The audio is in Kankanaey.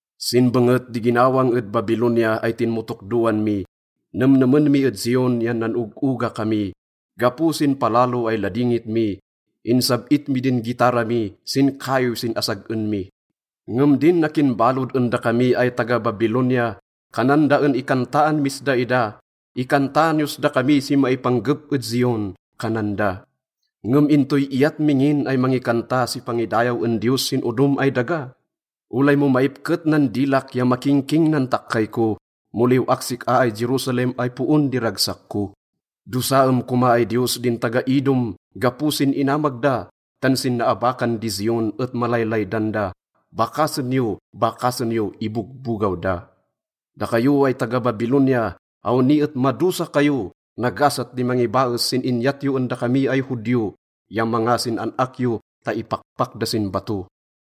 Sin benget di ginawang ed Babilonia ay tinmotokdoan mi, nemnemen mi ed Zion yan nan-og-oga kami. Gapo sin palalo ay ladingit mi, insab-it mi din gitara mi sin kaiw sin asag-en mi. Ngem din akin balod en dakami ay taga-Babilonia, kanan da en ikantaan mis daida. “Ikantaan yos dakami si maipanggep ed Zion,” kanan da. Ngem intoy iyat mi ngin ay mangikanta si pangidayaw en Diyos sin odom ay daga? Olay mo maipket nan dilak ya makingking nan takkay ko, mo liw-ak sik-a ay Jerusalem ay poon di ragsak ko. Dosaem koma ay Diyos din taga-Edom gapo sin inamag da, tan sin naabakan di Zion et malaylaydan da. “Bakasen yo, bakasen yo,” ibogbogaw da. Dakayo ay taga-Babilonia, awni et madosa kayo. Nagasat di mangibaes sin inyat yo en dakami ay Judio ya manga sin an-ak yo ta ipakpak da sin bato.